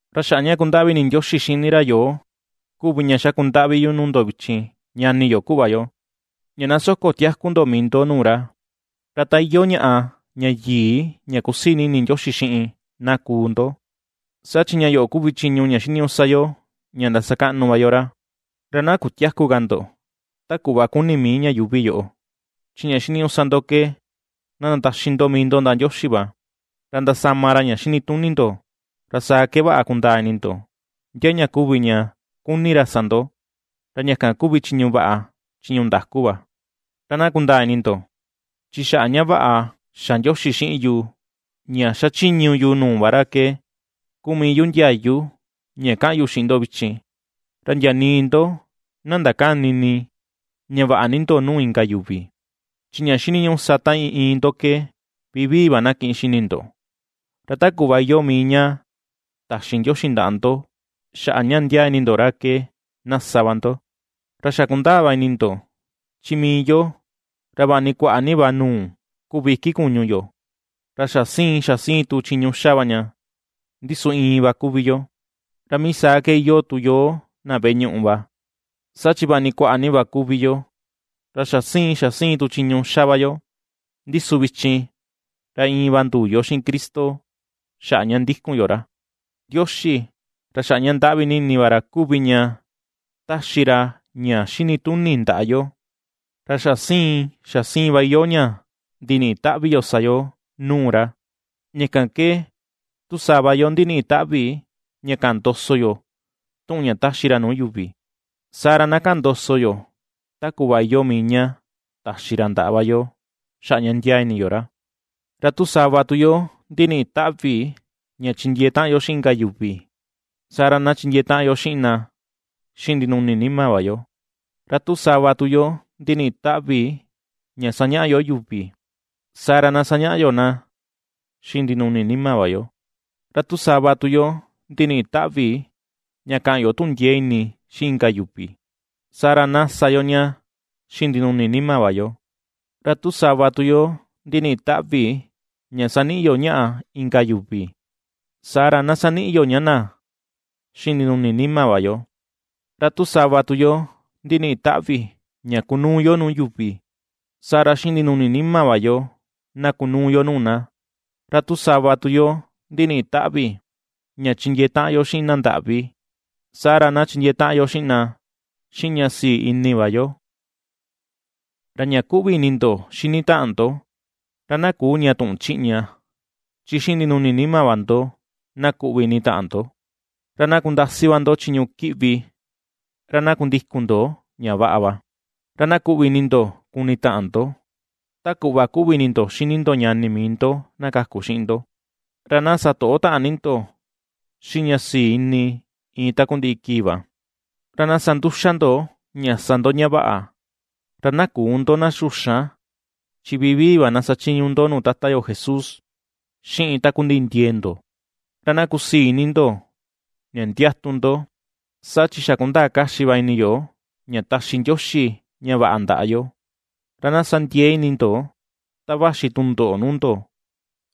Ra xaꞌa ña ^kundaꞌvi ini Ndioxi xini ra yoo kuvi ña xakundaꞌvi yu nuu ndo vichin, ñani yo, kuꞌva yo, ña na soko tiaku ndo mii ndo nuu ra, ra ta iyoo ñaꞌa ña yii ña kusii ni ini Ndioxi xiꞌin, na kuu ndo. Saa chi ña yoꞌo kuvi chiñu ña xiniñuꞌu sa yo, ña ^ndasakaꞌnu va yo ra. Ra na kutiäku ka ndo, ta kuꞌva kuni mii ña yuuvi yoꞌo, chi ña xiniñuꞌu sa ndo ke na ndataxi ndo mii ndo ndaꞌa Ndioxi va, ra ndasama ra ña xini tuni ndo, ra saa ke vaꞌa kundaa ini ndo, ndia ña kuvi ña kuni ra sa ndo, ra ña kan kuvi chiñu vaꞌa, chiñu ndaku va. Ra na kundaa ini ndo, chi xaꞌa ña vaꞌa xa Ndioxi xiꞌin yu ña ^xachiñu yu nuu va ra ke, kuu mii yu ndiayu ña ^kaꞌan yu xiꞌin ndo vichin, ra ndia nii ndo na ndakäni ini ña vaꞌa ni ndo nuu inka yuvi. Chi ña xiniñuꞌu sa ta iin iin ndo ke vivii va na kiꞌin xini ndo, ra ta kuꞌva iyoo mii ña taxi Ndioxi ndaꞌa ndo xaꞌa ña ndiaa ini ndo ra ke na sa va ndo. Ra xa kundaa va ini ndo, chi mii yo ra vaꞌa ni kuaꞌa ni va nuu kuvi iki kuñu yo, ra xa siin xa siin tu chiñu xa va ña, ndi su iin va kuvi yo. Ra mii saa ke iyoo tu yo na veꞌe ñuꞌu va, saa chi vaꞌa ni kuaꞌa ni va kuvi yo, ra xa siin xa siin tu chiñu xa va yo, ndi su vichin ra iin va nduu yo xiꞌin Cristo xaꞌa ña ndikun yo ra. Ndioxi ra xaꞌa ña ^ndaꞌvi ni ini va ra kuvi ña ^taxi ra ña xini tuni ndaꞌa yo, ra xa siin xa siin va iyoo ña ndiniꞌi taꞌvi yo sa yo nuu ra. Ña kan ke tu sava yo, ndiniꞌi taꞌvi ña kaꞌan ndoso yo tuꞌun ña taxi ra nuu yuvi, saa ra na kaꞌan ndoso yo ta kuꞌva iyoo mii ña taxi ra ndaꞌa va yo xaꞌa ña ndiaa ini yo ra. Ra tu sava tu yo ndiniꞌi taꞌvi ña chindiee taꞌan yo xiꞌin inka yuvi, saa ra na chindiee taꞌan yo xiꞌin na xiꞌin ndinuni nima va yo. Ra tu sava tu yo ndiniꞌi taꞌvi ña sañaꞌa yo yuvi, saa ra na sañaꞌa yo na xiꞌin ndinuni nima va yo. Ra tu sava tu yo ndiniꞌi taꞌvi ña kaꞌan yo tuꞌun ndiee ini xiꞌin inka yuvi, saa ra na sa yo ña xiꞌin ndinuni nima va yo. Ra tu sava tu yo ndiniꞌi taꞌvi ña saniꞌi yo ñaꞌa inka yuvi, saa ra na saniꞌi yo ña na xiꞌin ndinuni nima va yo. Ra tu sava tu yo ndiniꞌi taꞌvi ña kunuu yo nuu yuvi, saa ra xiꞌin ndinuni nima va yo na kunuu yo nuu na; ra tu sava tu yo ndiniꞌi taꞌvi ña chindiee taꞌan yo xiꞌin na ndaꞌvi, saa ra na chindiee taꞌan yo xiꞌin na xiꞌin ña sii ini va yo. Ra ña ^kuꞌvi ini ndo xini taꞌan ndo, ra na küu ña tuꞌun chiꞌña, chi xiꞌin ndinuni nima va ndo, na kuꞌvi ini taꞌan ndo. Ra na kundasi va ndo chiñu kiꞌvi, ra na kundikun ndo ña vaꞌa va. Ra na kuꞌvi ini ndo kuni taꞌan ndo, ta kuꞌva kuꞌvi ini ndo xini ndo ñani mii ndo na kaku xiꞌin ndo. Ra na satoꞌo taꞌan ni ndo xiꞌin ña sii ini iin takundiꞌi kii va. Ra na sa nduxa ndo ña sa ndo ña vaꞌa, ra na küu ndo na xuxan, chi vivii va na sachiñu ndo nuu Tata yo Jesús, xiꞌin takundiꞌi ndiee ndo. Ra na kusii ini ndo ña ndiatu ndo, saa chi xa kundaa kaxi va ini yo ña taxi Ndioxi ña vaꞌa ndaꞌa yo; ra na sa ndiee ni ini ndo, ta vaxi tundoꞌo nuu ndo.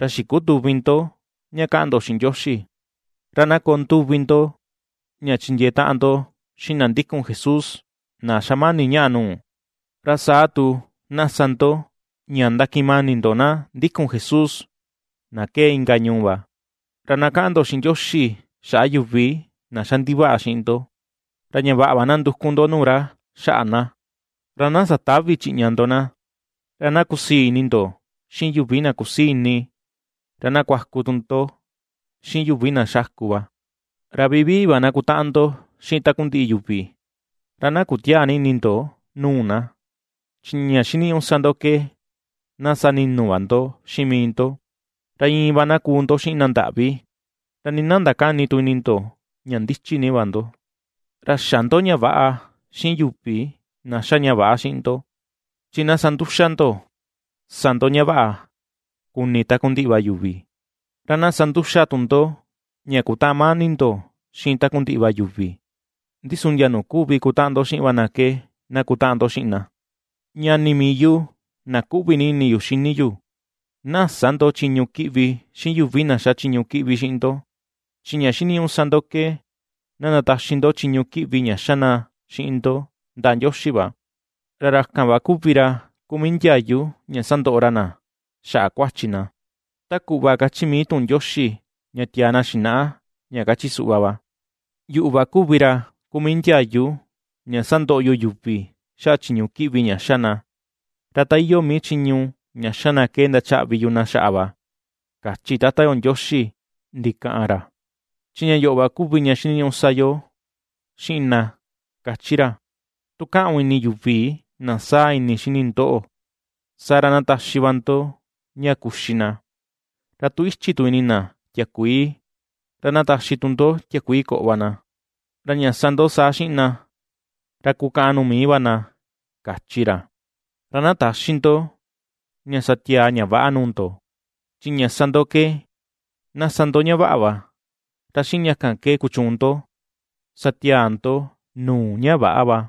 Ra xikutüvi ndo ña ^kaꞌan ndo xiꞌin Ndioxi. Ra na koo nduvi ndo, ña chindiee taꞌan ndo xiꞌin na ndikun Jesús na xamani ñaꞌa nuu; ra saa tu na sa ndo ña ndakiꞌin mani ndo na ndikun Jesús na ^kee inka ñuu va. Ra na kaꞌan ndo xiꞌin Ndioxi xaꞌa yuvi na xa ndivaꞌa xiꞌin ndo. Ra ña vaꞌa va na nduku ndo nuu ra xaꞌa na, ra na satävi chiꞌña ndo na. Ra na kusii ini ndo xiꞌin yuvi na kusii ini, ra na kuaku tu ndo xiꞌin yuvi na xáku va. Ra vivii va na kutaꞌan ndo xiꞌin takundiꞌi yuvi. Ra na kutiäa ni ini ndo nuu na, chi ña xiniñuꞌu sa ndo ke na sani̱nu̱ va ndo xiꞌin mii ndo, ra iin va na kuu ndo xiꞌin na nda̱ꞌví. Ra nii na ndakäni tu ini ndo ña ndichi ni va ndo. Ra xä ndo ña väꞌa xiꞌin yuvi na xa ña väꞌa xiꞌin ndo. Chi na sa nduxa ndo, ^sa ndo ña vaꞌa kuni takundiꞌi va yuvi. Ra na sa nduxa tu ndo ña kutaꞌan mani ndo xiꞌin takundiꞌi va yuvi, ndi su ndia nuu kuvi kutaꞌan ndo xiꞌin va na ke na kutaꞌan ndo xiꞌin na. Ñani mii yu na ^kuꞌvi ini yu xini yu, na sä ndo chiñu kiꞌvi xiꞌin yuvi na ^xa chiñu kiꞌvi xiꞌin ndo, chi ña xiniñuꞌu sa ndo ke na ndataxi ndo chiñu kiꞌvi ña xa na xiꞌin ndo ndaꞌa Ndioxi va, ra ra kan va kuvi ra kuu mii ndiayu ña sandoꞌo ra na xaꞌa kuachi na; ta kuꞌva kachi mii tuꞌun Ndioxi ña tiaa na xinaꞌa, ña kachi suꞌva va: “Yuꞌu va kuvi ra kuu mii ndiayu ña sandoꞌo yu yuvi xaꞌa chiñu kiꞌvi ña ^xa na, ra ta iyoo mii chiñu ña xa na ke ndachaꞌvi yu na xaꞌa va”, kachi Tata yo Ndioxi ndikaꞌan ra. Chi ña yoꞌo va kuvi ña xiniñuꞌu sa yo xiꞌin na kachi ra: “Tu kaꞌun ini yuvi na saa ini xini ndoꞌo, saa ra na taxi va ndo ña kuxi na, ra tu ichi tu ini na tiakuii ra na taxi tu ndo tiakuii koꞌo va na; ra ña sa ndo saa xiꞌin na, ra kukaꞌan nuu mii va na”, kachi ra. Ra na täxi ndo ña sa tiaa ña väꞌa nuu ndo, chi ña sa ndo ke na sa ndo ña vaꞌa va, ra xiꞌin ña kan ke kuchuun ndo sa tiaa ndo nuu ña väꞌa va.